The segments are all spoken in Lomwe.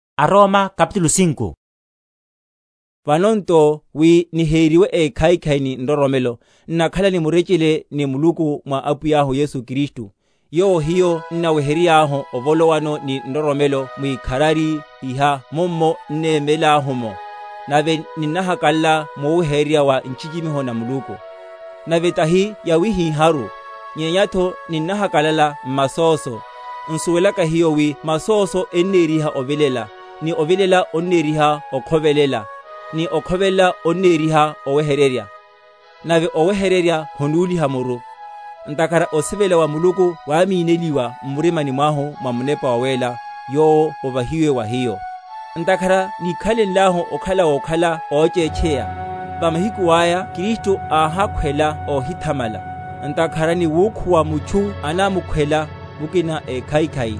Sawima saya sa nroromelo. Vano nto wi niheriwe ékhaikhai ni nroromelo, n’nakhala ni murechele ni Muluku mwa Apwiyahu Yesu Kristu; yowo hiyo n’naweryahu ovolowano ni nroromelo mwikharari iha mummo n’nemelahu’mo; nave ninnahakalala muwehererya wa nchichimiho na Muluku. Nave tahi yawihiháru, nyenyatho ninnahakalalela m’masóso; n’suwelaka hiyo wi masoso enneriha ovilela; ni ovilela onneriha okhovelela; ni okhovelela onneriha owehererya: nave owehererya honúliha muru; ntakhara osivela wa Muluku wámineliwa m’mirimani mwahu mwa Munepa Wawéla, yowo ovahiwe wa hiyo. Ntakhara níkhalenlahu okhala wokhala óchétcheya, va mahiku aya Kristu áhakhwela óhithamala. Ntakhara ni wukhuwa mutchu anamukhwela mukina ékhaikhai;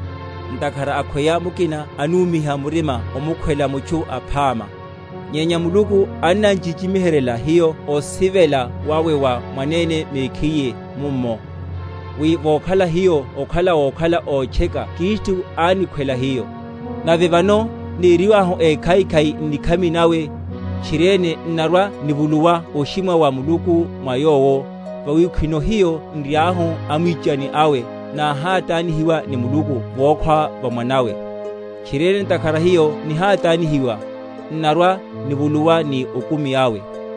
ntakhara akhweya mukina anúmiha murima omukhwela mutchu aphama. Nyenya Muluku annan’chichimiheryela hiyo osivela wawe wa mwanene mekhiye mummo, wi vokhala hiyo okhala wokhala ótcheka Kristu ánikhwela hiyo. Nave vano neriwahu ékhaikhai n’nikhami nawe, tchiriene n’narwa‐nivuluwa oshimwa wa Muluku mwa Yowo. Vawi khwino, hiyo n’riahu amwichani awe, náhátanihiwa ni Muluku vokhwa va Mwanawe, tchiriene ntakhara hiyo nihátanihiwa, n’narwa‐nivuluwa ni okumi awe.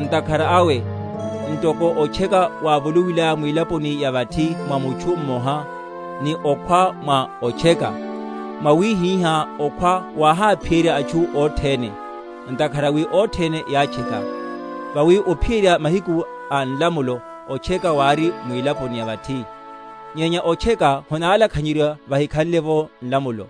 Ntakhara awe, ntoko otcheka wávolowilaya mwilaponi ya vathi mwa mutchu mmoha, ni okhwa mwa otcheka; mwawihihá okhwa wáháphiyerya atchu othene, ntakhara wi othene yátcheka. Vawi ophiyerya mahiku a nlamulo otcheka wári mwilaponi ya vathi; nyenya otcheka honálakhanyeryiwa vahikhanle’vo nlamulo.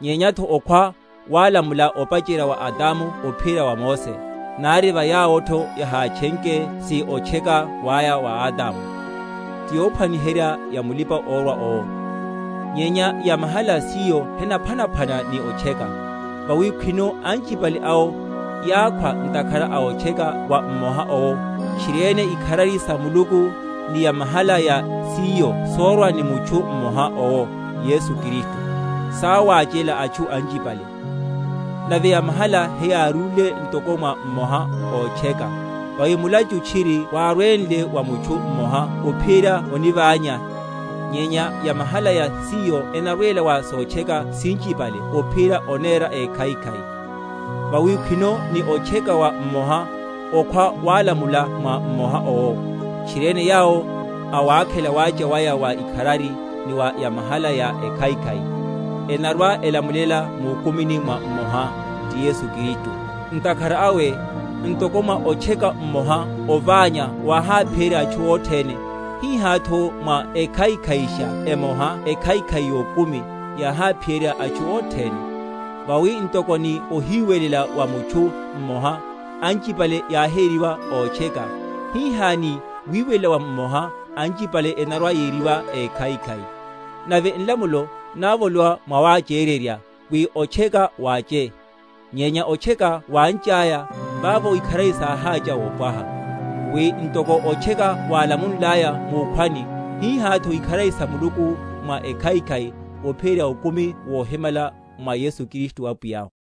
Nyenyatho okhwa wálamula opacherya wa Adamu ophiyerya wa Mose, nari va yawotho yahátchenke si otcheka waya wa Adamu, ti yophwaniherya ya mulipa‐orwa owo. Nyenya yamahala ya siyo henaphwanaphwana ni otcheka. Vawi khwino anchipale awo yákhwa ntakhara a otcheka wa mmoha owo, tchiriene ikharari sa Muluku, ni yamahala ya siyo sórwa ni mutchu mmoha owo Yesu Kristu, sáwáchela atchu anchipale. Nave yamahala heyárúle ntoko mwa mmoha ótcheka, vawi mulachu tchiri wárwenle wa mutchu mmoha ophiyerya oniványa, nyenya yamahala ya siyo enarwela wa sotcheka sinchipale ophiyerya onéra ékhaikhai. Vawi khwino, ni otcheka wa mmoha, okhwa wálamulela mwa mmoha owo; tchiriene yawo, awákhela wacha waya wa ikharari ni wa yamahala ya ekhaikhai, enarwa‐elamulela mukumini mwa mmoha, ti Yesu Kristu. Ntakhara awe, ntoko mwa otcheka omoha oványa wáháphiyerya atchu othene; hihátho mwa ekhaikhaisha emoha ekhaikhai yokumi yáháphiyerya atchu othene. Vawi ntoko ni ohiwelela wa mutchu mmoha, anchipale yáhériwa ótcheka, hihá ni wiwelela wa mmoha anchipale enarwa‐yeriwa ékhaikhai. Nave nlamulo návolowa mwawachererya, wi otcheka wáche; nyenya otcheka wánchaya, vavo ikharari sáhácha wopwaha; wi, ntoko otcheka wálamunlaya mukhwani, hihátho ikharari salamule mwa ekhaikhai, ophiyerya okumi wohimala mwa Yesu Kristu Apwiyahu.